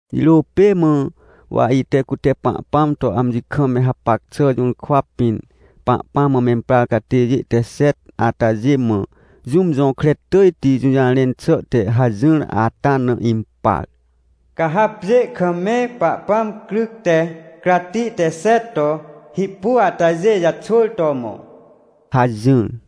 Jirô pê mã, wa ite cute Pahpãm to amji kam me hapac xà jũrkwa pĩn, Pahpãm mã memprar catêjê te xet atajê mã, jũm jõkre tỳjti jũjarẽn xà te hajỹr ata na impar: — Ca ha pjê kam me Pahpãm cryc te cratti te xet to hipu atajê jaxwỳr to mõ — hajỹr.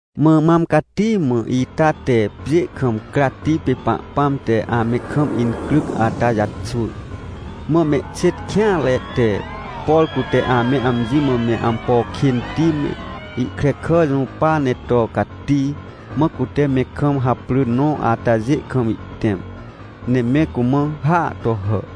Mã mam cati mã ita te pjê kam cratti pê Pahpãm te ame kam incryc ata jaxwỳr. Mã mehxêt kêanre te, por cute ame amji mã me ampo kênti me, ihkrekà jũpa ne to cati, mã cute me kam haprỳ nõ atajê kam ihtẽm, ne me cumã hàa to hà.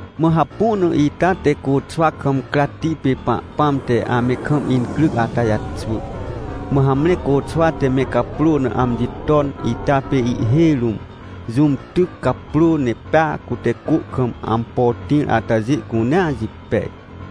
Mã hapu na ita te côxwa kam cratti pê Pahpãm te ame kam incryc ata jaxwỳr. Mã hamre côxwa te me caprô na amji ton ita pê ihhêj rũm jũm tyc caprô, ne pea cute cô kam ampo tĩr atajê cunea jipej.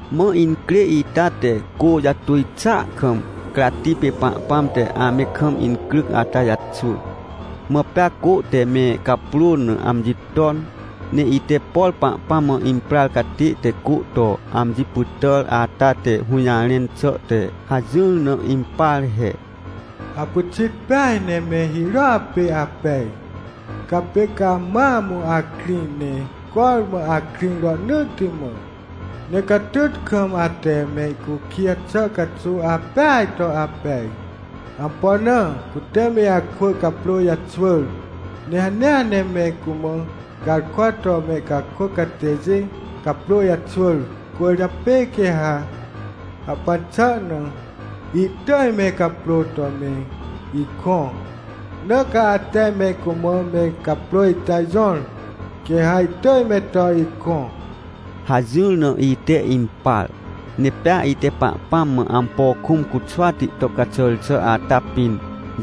Mã incrê ita te cô jatuj xàa kam cratti pê Pahpãm te ame kam incryc ata jaxwỳr. Mã pea cô te me caprô na amji ton. Ne ite, por Pahpãm mã imprar catê te cô to amji pytàr ata te hũjarẽn xà te hajỹr na impar he: — Apyxit peaj ne me hirôa pê apej! Caa pê ca mam akrĩ, ne cormã akrĩ rohnỳtti mã. Ne catyt kam ate mehcukij xà caxuw apeaj to apej. Ampo na? Cute me akwỳ caprô jaxwỳr, ne hanea ne me cumã garkwa to mehcakôc catêjê caprô jaxwỳr, cwỳrjapê quê ha hahpan xà na ihtỳj me caprôa to me ikõ, na ca ate me cumã me caprô ita jõr, quê ha ihtỳj me to ikõ — hajỹr na, ite impar. Ne pea ite Pahpãm mã ampo kũm cuxwati to caxàr xà ata pĩn,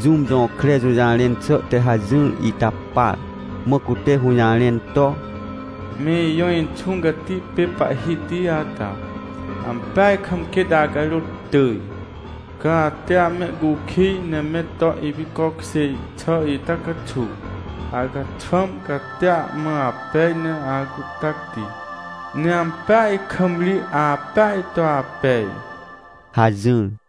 jũm jõkre jũjarẽn xà te hajỹr ita par, mã cute hũjarẽn to: — Me ijõ Inxũ Cati pê Pahhiti ata, ampeaj kam quêt acarôt tỳj. Ca ate amehcukij ne me to ipicokjêr xà ita caxuw, acaxwãm catia mã apej ne acuhtacti, ne ampeaj kam ri apeaj to apej — hajỹr.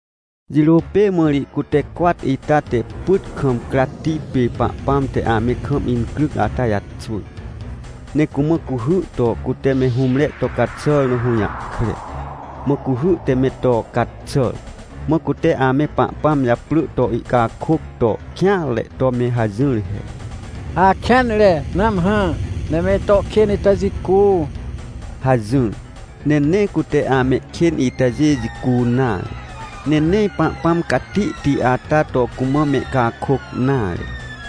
Jirô pê mã ri cute cwat ita te pyt kam cratti pê Pahpãm te ame kam incryc ata jaxwỳr, ne cumã cuhy to cute me hũmre to caxàr na hũjahkre. Mã cuhy te me to caxàr, mã cute ame Pahpãm japrỳ to ihcakôc to kêanre to me hajỹr he: — Akêanre! Nãmhã, ne me ito kên ita jicu! — hajỹr. Ne nee cute amehkên itajê jicu nare, ne nee Pahpãm catihti ata to cumã mehcakôc nare.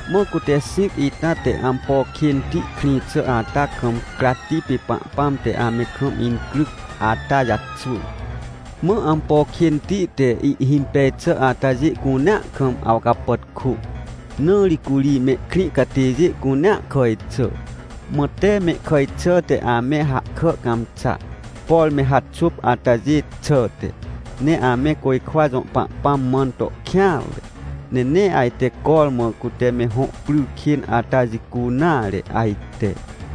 Mã cute xĩc ita te ampo kênti krĩ xà ata kam cratti pê Pahpãm te ame kam incryc ata jaxwỳr. Mã ampo kênti te ihhimpej xà atajê cunea kam awcapàtkô, na ri curi mehkrĩ catêjê cunea kàj xà. Mã tee mehkàj xàhte ame hahkà cãmxa, por me haxôp atajê xàhte. Ne ame côjkwa jõ Pahpãm mãn to kêanre, ne nee ajte cormã cute me hõ pry kên ata jicu nare ajte.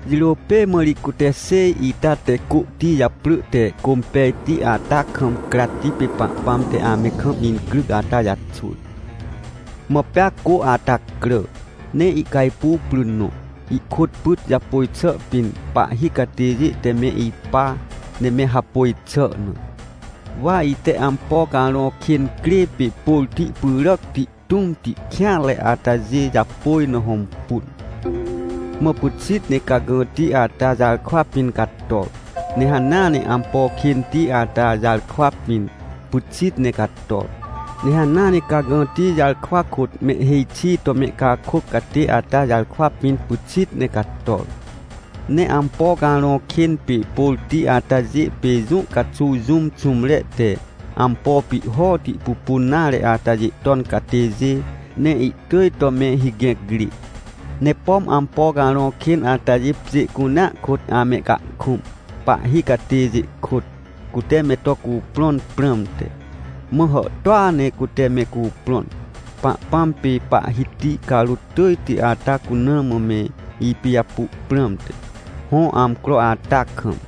Jirô pê mã ri cute xêj ita te côhti japrỳ te Cômpejti ata kam cratti pê Pahpãm te ame kam incryc ata jaxwỳr. Mã pea cô ata crà, ne ihcajpuw pry nõ, ihkôt pyt japôj xà pĩn pahhi catêjê te me ipa, ne me hapôj xà na. Wa ite ampo carõ kên crê pê pôrti pyràcti, tũmti, kêanre atajê japôj na hõmpun. Mã pyxit ne cagãti ata jarkwa pĩn cator, ne hanea ne ampo kênti ata jarkwa pĩn pyxit ne cator, ne hanea ne cagãti jarkwa kôt mehhêj xi to mehcakôc catê ata jarkwa pĩn pyxit ne cator. Ne ampo carõ kên pê pôrti atajê pê jũ caxuw jũm xũmre te ampo pihhoti pupun nare atajê ton catêjê, ne ihtỳj to me higẽc rê. Ne pom ampo carõ kên atajê pjê cunea kôt amehcahkũm, pahhi catêjê kôt, cute me to cuprõn prãmte. Mã hàhtôa ne cute me cuprõn, Pahpãm pê Pahhiti carôt tỳjti ata cuna mã me ipijapu prãmte, hõ amcro ata kam.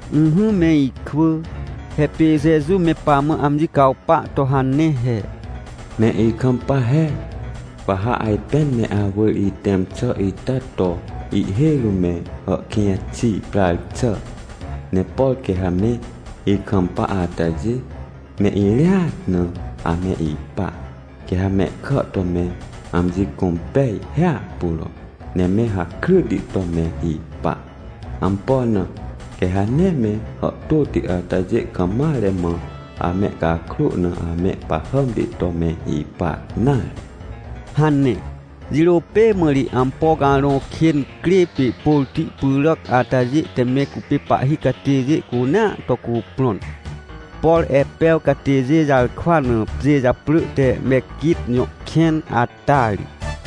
Ỹhỹ me ikwỳ, he pê Jeju me pamã amji cawpa to hane he: — Me ikampa he, wa ha ajpên me awỳr itẽm xà ita to ihhêj rũm me hàhkĩj xi prar xà! Ne por quê ha me ikampa atajê, me irĩat na ame ipa. Quê ha mehkà to me amji cũmpej hiahpuro ne me hakryti to me ipa. Ampo na? Quê ha nee me hàhtôti atajê kam mare mã amehcakrô na amehpahàmti to me ipa nare — hane. Jirô pê mã ri ampo carõ kên crê pê pôrti pyràc atajê te me cupê pahhi catêjê cunea to cuprõn, por Epew catêjê jarkwa na pjê japrỳ te Mequit jõ kẽn ata ri.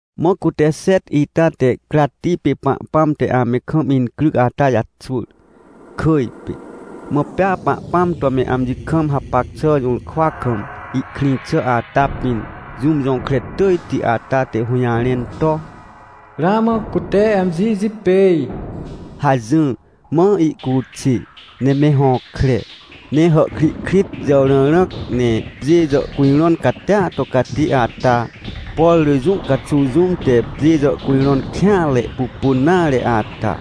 Mã cute xet ita te cratti pê Pahpãm te ame kam incryc ata jaxwỳr, kỳj pê. Mã pea Pahpãm to me amji kam hapac xà jũrkwa kam ihkrĩ xà ata pĩn, jũm jõkre tỳjti ata te hũjarẽn to: — Ramã cute amji jipêj! — hajỹr. Mã ihcuxê, ne me hõkre, ne hàhkrihkrit jàwrãrãc, ne pjê jàhcujrõn catia to cati ata, por rỳ jũ caxuw jũm te pjê jàhcujrõn kêanre pupun nare ata.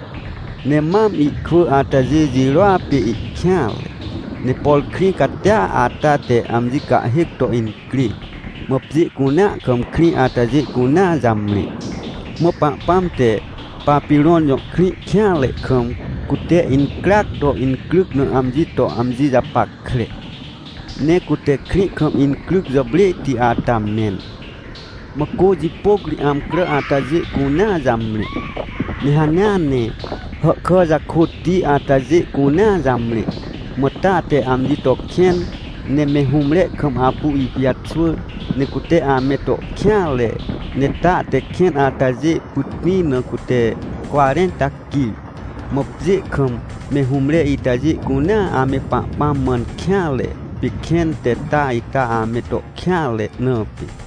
Ne mam ihkwỳ atajê jirôa pê ihkêanre. Ne por krĩ catia ata te amji cahhêc to incrê, mã pjê cunea kam krĩ atajê cunea jamre. Mã Pahpãm te Papirõn jõ krĩ kêanre kam, cute incryac to incryc na amji to amji japackre. Ne cute krĩ kam incryc jàprêhti ata mẽn. Mã cô jipôc ri amcrà atajê cunea jamre. Ne hanea ne hàhkà jakôtti atajê cunea jamre. Mã ta te amji to kẽn ne me hũmre kam apu ipijaxwỳr, ne cute ame to kêanre, ne ta te kẽn atajê pytĩ na cute cwarẽnta quir. Mã pjê kam me hũmre itajê cunea ame Pahpãm mãn kêanre, pê kẽn te ta ita ame to kêanre, na pê.